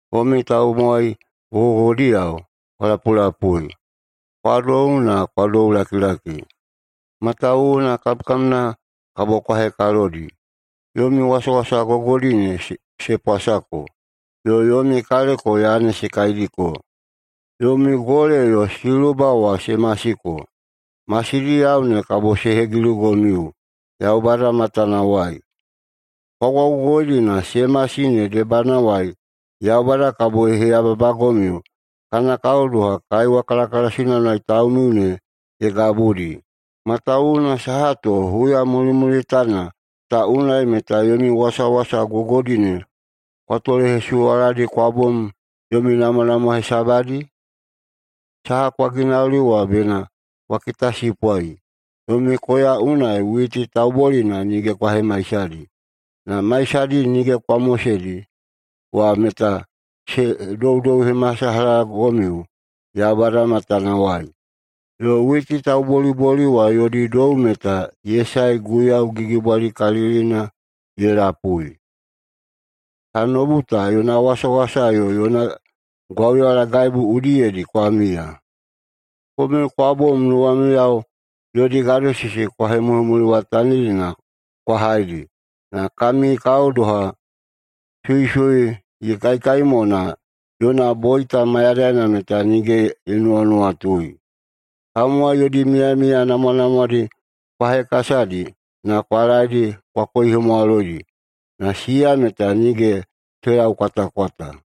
Komiu tamowai gogogogodiyao, kwa lapulapui! Kwa dou na kwa doulakilaki, matawuwuna kamkamna kabo kwa hekalodi. Yomi wasawasa gogodi ne se pwasako, yo yomi kaleko yane se kaidiko. Yomi gole yo siluba wa se masiko. Masidiyao ne kabo se hegilugomiu Yaubada matanawai. Kwa gwaugogoidi na se masi ne debadiwai Yaubada kabo ye heyababagomiu kana kao doha kaiwa kalakalasina unai taumiu ne ye gabudi. Matawuwuna saha to huya mulimulitana ta unai meta yomi wasawasa gogodi ne kwa tolehesuwaladi kwa bom yomi namwanamwa hesabadi? Saha kwa ginauli wa bena kwa kitasipwai! Yomi koya unai witi taubolina nige kwa hemaisadi. Na maisadi nige kwa moseidi wa meta se doudouhemasalahagomiu Yaubada matanawai. Yo witi tauboliboli wa yodi dou meta ye sae Guiyau Gigibwalikalilina ye lapui. Tanoubu ta yona wasawasa yo yona gwauyalagaibu udiyedi kwa miya. Komiu kwa bom nuwamiyao yodi gadosisi kwa hemuliwatanidi na kwa haidi. Na kami kao ede doha suisui ye kaikai mo na yona boita mayadaina meta nige ye nuwanuwatui. Tamowai yodi miyamiya namwanamwadi kwa hekasadi na kwa laeidi kwa koihemwaloidi, na siya meta nige se laukwatakwata.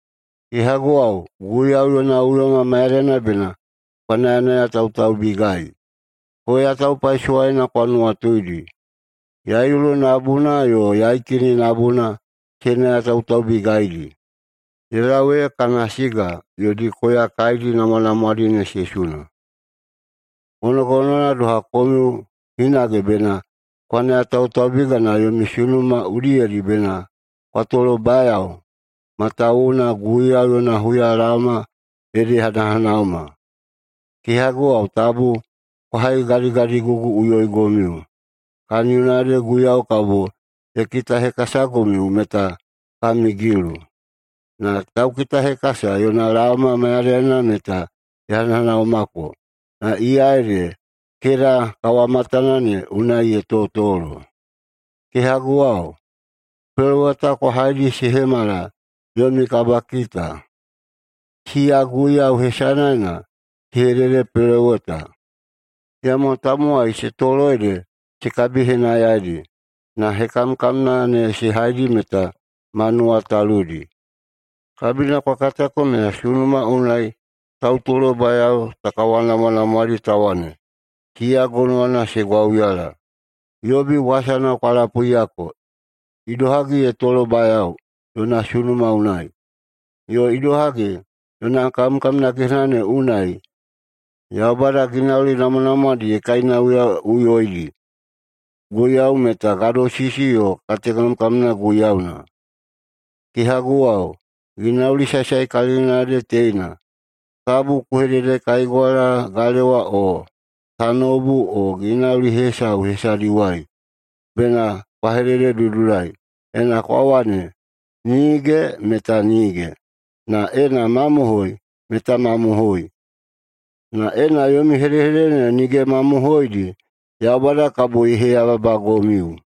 Kehaguwao, Guiyau yona uyoma mayadaina bena kwa nayanayatautaubigai. Koya taupaisowaina kwa nuwatuidi. Yaiulu nabuna yo yaikini nabuna se nayatautaubigaidi, ye lau ee kana siga yodi koya kaidi namwanamwadi ne se suna. Gonogonowana doha komiu hinage bena kwa nayatautaubiga na yomi sunuma udiyedi bena kwa tolobayao, matawuwuna Guiyau yona huyalaoma ede ye hanahanaoma. Kehaguwao, tabu kwa haigadigadiguguꞌuyoigomiu, kaniyona ede Guiyau kabo ye kitahekasagomiu meta kami gilu. Na Tauhekasa yona laoma mayadaina meta ye hanahanaomako na iya ede keda kawamatana ne unai ye totolo. Kehaguwao, peloweta kwa haidi se hemala yomi kabakita. Siya Guiyau hesanaena se hededepeloweta, iyamo tamowai se tolo ede se kabihenayaidi, na hekamkamna ne se haidi meta ma nuwataludi. Kabina kwa katako meta sunuma unai tautolobayao ta kawanamwanamwaedi ta wane, siya gonowana se gwauyala. Yobi wasana kwa lapuiyako, idohagi ye tolobayao yona sunuma unai, yo idohagi yona kamkamna gehena ne unai Yaubada ginauli namwanamwadi ye kainauyaꞌuyoidi. Guiyau meta gadosisi yo katekamkamna Guiyauna. Kehaguwao, ginauli saesaekalilina ede teina: Tabu kwa hededekaigwala galewa, o tanoubu, o ginauli hesau hesadiwai. Bena kwa hedededudulai! Ena kwa wane, “Nige” meta nige, na ena “mamohoi” meta mamohoi. Na ena yomi hedehedede ne nige mamohoidi, Yaubada kabo ye heyababagomiu.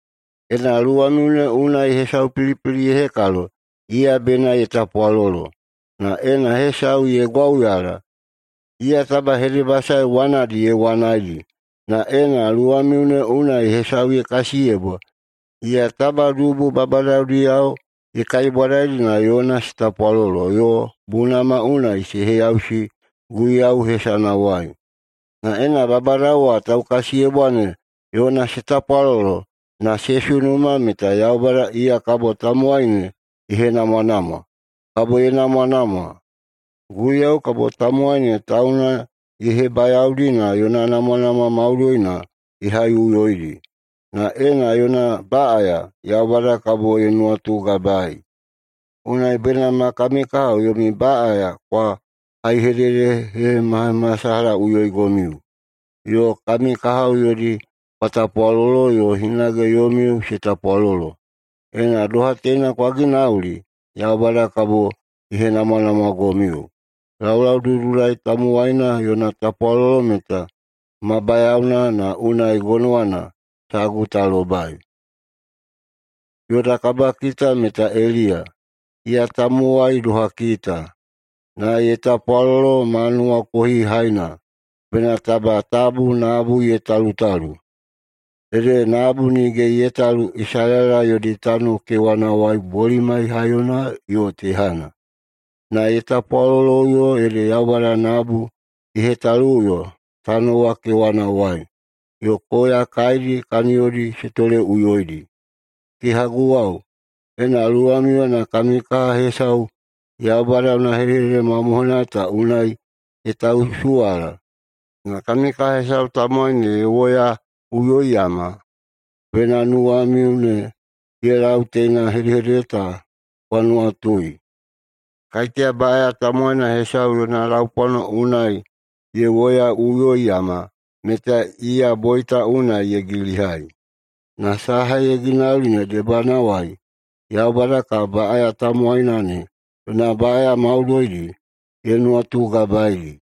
Ena luwamiu ne unai hesau pilipili ye hekalo, iya bena ye tapwalolo. Na ena hesau ye gwauyala, iya taba hedebasae wanadi ye wanaidi. Na ena luwamiu ne unai hesau ye kasiyebwa, iya taba dubu babadadiyao ye kaibwadaidi na yona se tapwalolo yo bunama unai se heyausi Guiyau hesanawai. Na ena babadao wa taukasiyebwa ne yona se tapwalolo, na se sunuma meta Yaubada iya kabo tamowai ne ye henamwanamwa, kabo ye namwanamwa. Guiyau kabo tamowai ne tauna ye hebayaodi na yona namwanamwa maudoina ye haiꞌuyoidi. Na ena yona baꞌaya, Yaubada kabo ye nuwatugabaei. Unai bena ma kami kahao yomi baꞌaya kwa haihededehemahemasalahaꞌuyoigomiu, yo kami kahao yodi kwa tapwalolo yo hinage yomiu se tapwalolo. Ena doha teina kwa ginauli, Yaubada kabo ye henamwanamwagomiu. Laulaududulai tamowaina yona tapwalolo meta ma bayaona na unai gonowana sagu ta lobai. Yoda kabakita meta Eliya. Iya meta tamowai doha kita, na ye tapwalolo ma nuwakohihaina bena taba tabu nabu ye talutalu. Ede nabu nige ye talu Isalaela yodi tano kewanawai bolimai haiyona yo tehana. Na ye tapwaloloꞌuyo, ede Yaubada nabu ye hetaluꞌuyoi tano wa kewanawai, yo koya kaidi kaniyodi se toleꞌuyoidi. Kehaguwao, ena luwamiuyena kami kaha hesau Yaubada yona hedehedede mamohoina ta unai ye tausuwala, na kami kaha hesau tamowai ne ye woyaꞌuyoiyama, bena nuwamiu ne ye lau teina hedehedede ta kwa nuwatui: Kaiteya baꞌaya tamowaina hesau yona laupwano unai ye woyaꞌuyoiyama, meta iya boita unai ye gilihai, na saha ye ginauli ne debanawai Yaubada kabo baꞌaya tamowaina ne yona baꞌaya maudoidi ye nuwatugabaedi.